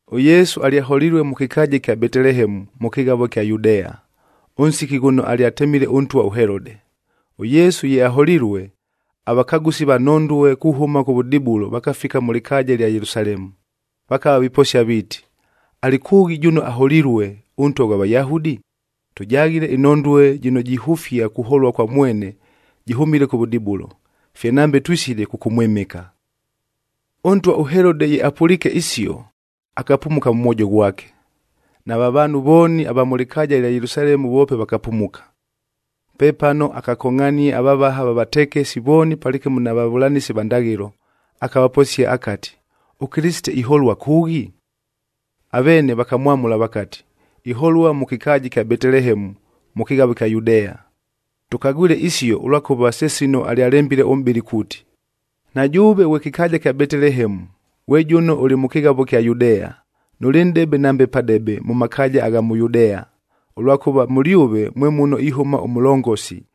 ɄYesu alyaholilue mʉ kɨkaaja ɨkya Betelehemu, mʉ kɨghavoa ɨkya Yudea, ʉnsiki ghʉno alyatemile ʉntwa ʉHelode. ɄYesu ye aholilue, avakagʉsi va nhondue kuhʉma kʉvʉdibulo vakafika mʉ lɨkaaja ɨlya Yelusalemu, vakava viposia viiti, “Alɨ kʉʉghi jʉno aholilue, ʉNtwa ghwa Vayahudi? Tʉjaghile ɨnhondue jɨno jihʉfia kuholua kwa mwene jɨhʉmile kʉvʉdibulo, fye nambe twisile kʉkʉmwɨmɨka.” Ʉntwa ʉHelode ye apʉliike isio, akapumuka mʉ mwojo ghwake. Nava vaanhu vooni ava mʉ lɨkaaja ɨlya Yelusalemu voope vakapumuka. Pepano akakongʼhania avavaha va vatekesib vooni palɨkɨmo na vavʉlanɨsi va ndaghɨlo,c akavaposia akati, “ɄKɨlɨsite iholua kʉʉghi?” Aveene vakamwamʉla vakati, “Iholua mʉ kɨkaaja ɨkya Betelehemu, mʉ kɨghavo ɨkya Yudea. Tʉkagwile isio, ʉlwakʉva se sino alyalembile ʉmʼbɨli kuuti, ‘Na jʉʉve ghwe kɨkaaja kya Betelehemu, ghwe jʉno ʉlɨ mʉ kɨghavo ɨkya Yudea, nʉlɨ nʼdebe nambe padebe mʉ makaaja agha mʉ Yudea! Ʉlwakʉva mʉlyʉve mwe muno ihʉma ʉmʉlongosi,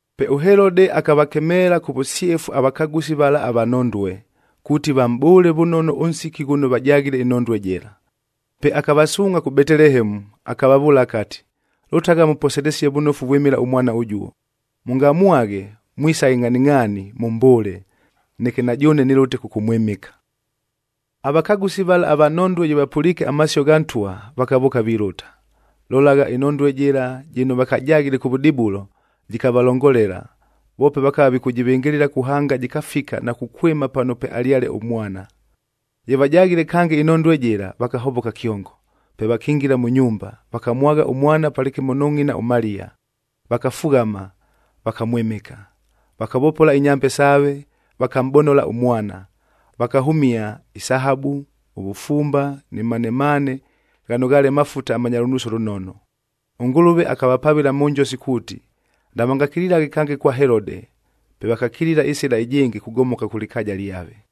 Pe ʉHelode akavakemeela kʉ vʉsyefu avakagʉsi vala ava nhondue, kuuti vamʼbʉʉle vʉnono ʉnsiki ghʉno vajaghile ɨnhondue jɨla. Pe akavasuungʼha kʉ Betelehemu, akavavʉʉla akati, “Lʉtagha, mʉposelesie vʉnofu vwɨmɨla ʉmwana ʉjuo. Mʉngamwaghe, mwisaghe ngʼhaningʼhaani mʉmbʉʉle, neke na jʉʉne nɨlʉte kʉkʉmwɨmɨka.” Avakagʉsi vala ava nhondue ye vapʉliike amasio gha ntwa, vakavʉʉka vilʉta. Lolagha, ɨnhondue jɨla jɨno vakajaghile kʉvʉdibulo, jɨkavalongolela, voope vakava vikʉjɨvɨngɨlɨla kuhanga jɨkafika na kukwɨma pano pwealyale ʉmwana. Ye vajaghile kange ɨnhondue jɨla, vakahovoka kyongo. Pe vakingila mʉ nyumba, vakamwagha ʉmwana palɨkɨmo nʉ ngʼina ʉMaliya, vakafughama, vakamwɨmɨka. Vakavopola inyambe saave, vakamʼbonola ʉmwana, vakahʉmia: ɨsahabu, ʉvʉfumbae ni manemane ghano ghaale mafuta amanya lʉnuusi ʉlʉnono. ɄNgʉlʉve akavapavɨla mʉ njosi kuuti, navangakililaghe kange kwa Helode. Pe vakakilila ɨsɨla ɨjɨngɨ kugomoka kʉ lɨkaaja lyave.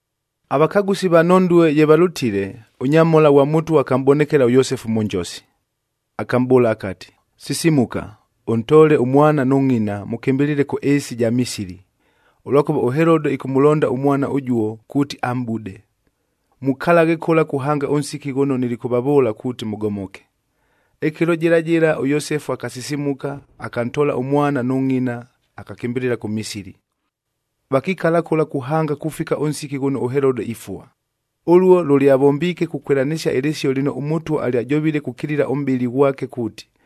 Avakagʉsi va nhondue ye valʉtile, ʉnyamhola ghwa Mʉtwa akamʼbonekela ʉYosefu mʉ njosi, akamʼbʉʉla akati, “Sisimuka! Ʉntoole ʉmwana nʉ ngʼina, mʉkɨmbɨlɨle kʉ ɨɨsi ɨja Misili, ʉlwakʉva ʉHelode ɨkʉmʉlonda ʉmwana ʉjuo kuuti amʼbude. Mukalaghe kʉla kuhanga ʉnsiki ghʉno nilikʉvavʉʉla kuuti mʉgomoke.” Ɨkɨlo jɨla jɨla ʉYosefu akasisimuka, akantoola ʉmwana nʉ ngʼina, akakɨmbɨlɨla kʉ Misili. Vakikala kʉla kuhanga kufika ʉnsiki ghʉno ʉHelode ifua. Ʉluo lʉlyavombiike kukwɨlanɨsia ɨlɨsio lɨno ʉMʉtwa alyajovile kukilila ʉmʼbɨli ghwake kuuti,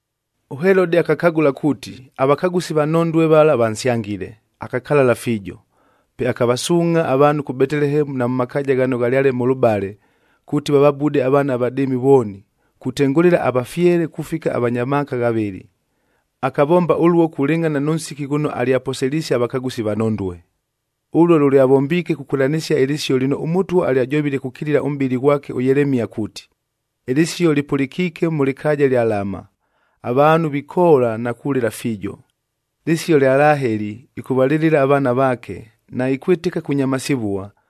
ɄHelode akakagʉla kuuti, avakagʉsi va nhondue vala vansyangile, akakalala fiijo. Pe akavasuungʼha avaanhu kʉ Betelehemu na mʉ makaaja ghano ghalyale mʉlʉbale, kuuti vavabude avaana avadɨɨmi vooni, kutengʉlɨla avafyele kufika avanya maaka ghavɨlɨ. Akavomba ʉluo kulɨngʼhana nʉ nsiki ghʉno alyavaposisie avakagʉsi va nhondue. Ʉluo lʉlyavombiike kukwɨlanɨsia ɨlɨsio lɨno ʉMʉtwa alyajovile kukilila ʉmʼbɨli ghwake ʉYelemia kuuti, “Ɨlɨsio lɨpʉlɨkiike mʉ lɨkaaja ɨlya Lama, avaanhu vikoola na kulɨla fiijo. Lɨsio lya Laheli, ɨkʉvalɨlɨla avaana vaake, naikwɨtɨka kunyamasivua,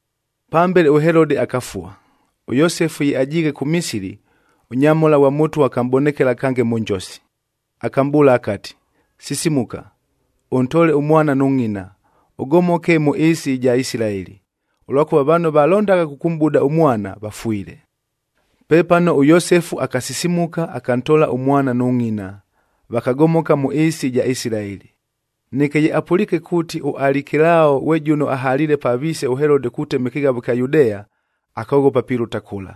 Pambele ʉHelode akafua. ɄYosefu ye ajiighe kʉ Misili, ʉnyamhola ghwa Mʉtwa akamʼbonekela kange mʉ njosi. Akamʼbʉʉla akati, “Sisimuka! Ʉntoole ʉmwana nʉ ngʼina, ʉgomoke mʉ ɨɨsi ɨja Isilaeli, ʉlwakʉva vano valondagha kʉkʉmʼbuda ʉmwana, vafwile.” Pepano ʉYosefu akasisimuka, akantoola ʉmwana nʉ ngʼina, vakagomoka mʉ ɨɨsi ɨja Isilaeli. Neke ye apʉliike kuuti ʉAlikelao ghwe jʉno ahaliile pa viise ʉHelode kutema ɨkɨghavo ɨkya Yudea, akoghopa pilʉta kʉla.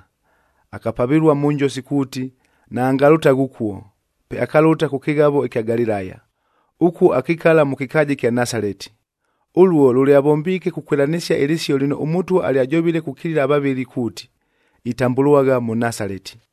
Akapavɨlua mʉ njosi kuuti naangalʉtaghe ʉkuo, pe akalʉta kʉ kɨghavo ɨkya Galilaya. Ʉkuo, akikala mʉ kɨkaaja ɨkya Nasaleti. Ʉluo, lʉlyavombiike kukwɨlanɨsia ɨlɨsio lɨno ʉMʉtwa alyajovile kukilila avavɨli kuuti, “Itambʉlwagha Mʉnasaleti.”